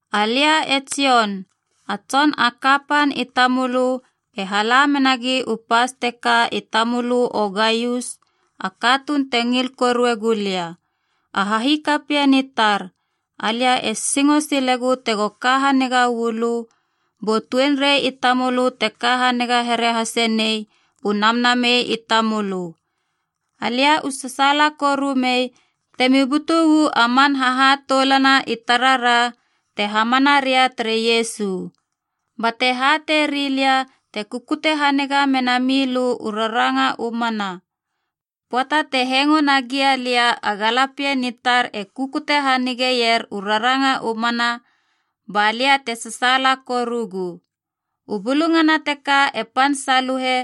Alia e Jon, a tson a kapan i tamölö e hala menagi u pas teka i tamölö o Gaius a katuun te ngil korue gulia. A hahikapien i tar, alia e singo silegu tego ka haniga uu lö, bu tuenrei i tamölö te ka haniga here hase nei u namnamei i tamölö. Alia u sasaala koru mei temi butu uu a man hahatoulana i tarara te hamana ria tere Iesu, bate hatei rilia te kukute haniga mena milö u raranga u mana. Pöata te hengo nagia lia a galapien i tar e kukute hanigeier u raranga u mana, ba lia te sasaala korugu. U bulungana teka e pan saluhe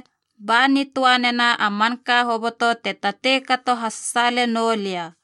ba nitöa nena a manka hoboto te tatei kato hasasaale noulia.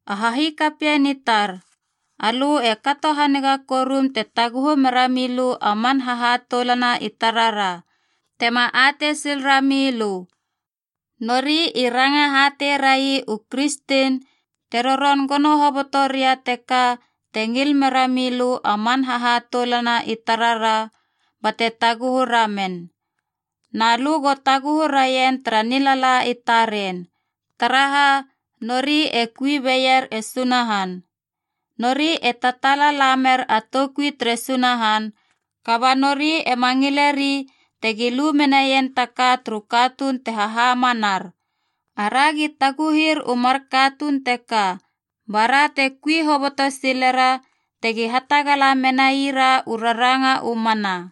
A hahikapien i tar, alö e kato haniga korum te taguhu mera milö a man hahatoulana i tarara, tema atei sil rami lö. Nori i ranga hatei rai u kristen te roron gono hoboto ria teka te ngil mera milö a man hahatoulana i tarara bate taguhu ramen. Na lö go taguhu raien tara nilala i taren, taraha nori e kui beier e Sunahan. Nori e tataala lamer a toukui tere Sunahan, kaba nori ema ngileri tegi lu menaien ta ka turu katuun te hahamanar. Aragi taguhir u mar katuun teka, bara te kui hoboto silera tegi hatagala menaira u raranga u mana.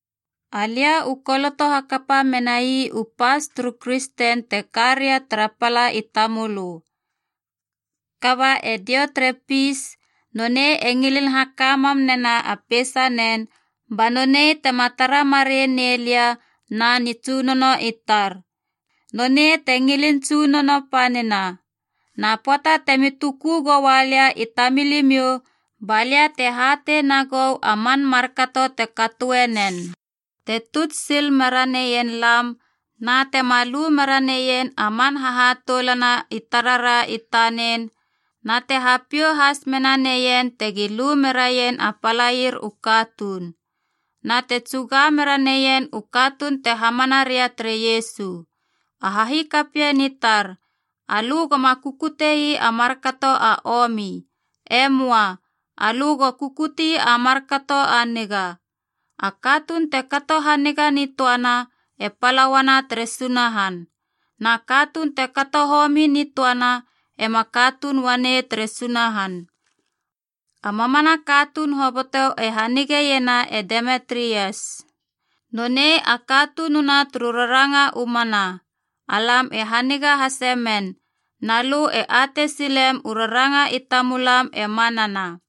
Alia u koloto hakapa menai u pas turu kristen te ka ria tara pala i tamölö. Kaba e Diotrepis, nonei e ngilin haka mam nena a peisanen ba nonei tema tara marei nei lia na nitsunono i tar. Nonei te ngilin tsunono panina. Na pöata temi tuku goua lia i tamilimiou ba lia te hatei nagou a man markato te katoe nen. Te tuts sil mera neien lam, na tema lu mera neien a man hahatoulana i tarara i tanen, na te hapiou has mena neien tegi lu meraien a palair u katuun. Na te tsuga mera neien u katuun te hamana ria tere Iesu. A hahikapien i tar, alö goma kukute ii a markato a omi. E möa. Alö go kukutie a markato a niga. A katuun te kato haniga nitöana, e pala uana tere Sunahan. Na katuun te kato homi nitöana ema katuun uanei tere Sunahan. A mamana katuun hoboto e hanigeiena e Demitrias. Nonei a katununa turu raranga u mana. Alam e haniga hase men, na lö e atei silem u raranga i tamulam e manana.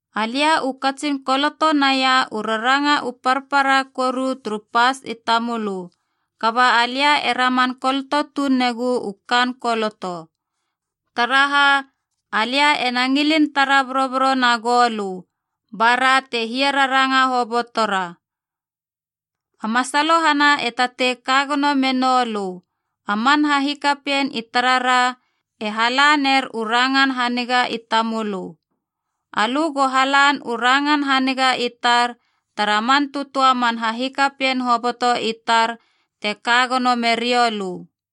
Alia u katsin koloto naia u raranga u parpara koru turu pas i tamölö, kaba alia e raman koloto tuun negu u kaan koloto. Taraha, alia ena ngilin tara boroboro na goulö, ba ra te hiararanga hobotora. A masalohana e tatei ka gono menou lö. A man hahikapien i tarara e hala ner u rangan haniga i tamölö. Alö go halan u rangan haniga i tar tara man tötöa man hahikapien hoboto i tar te ka gono merioulö.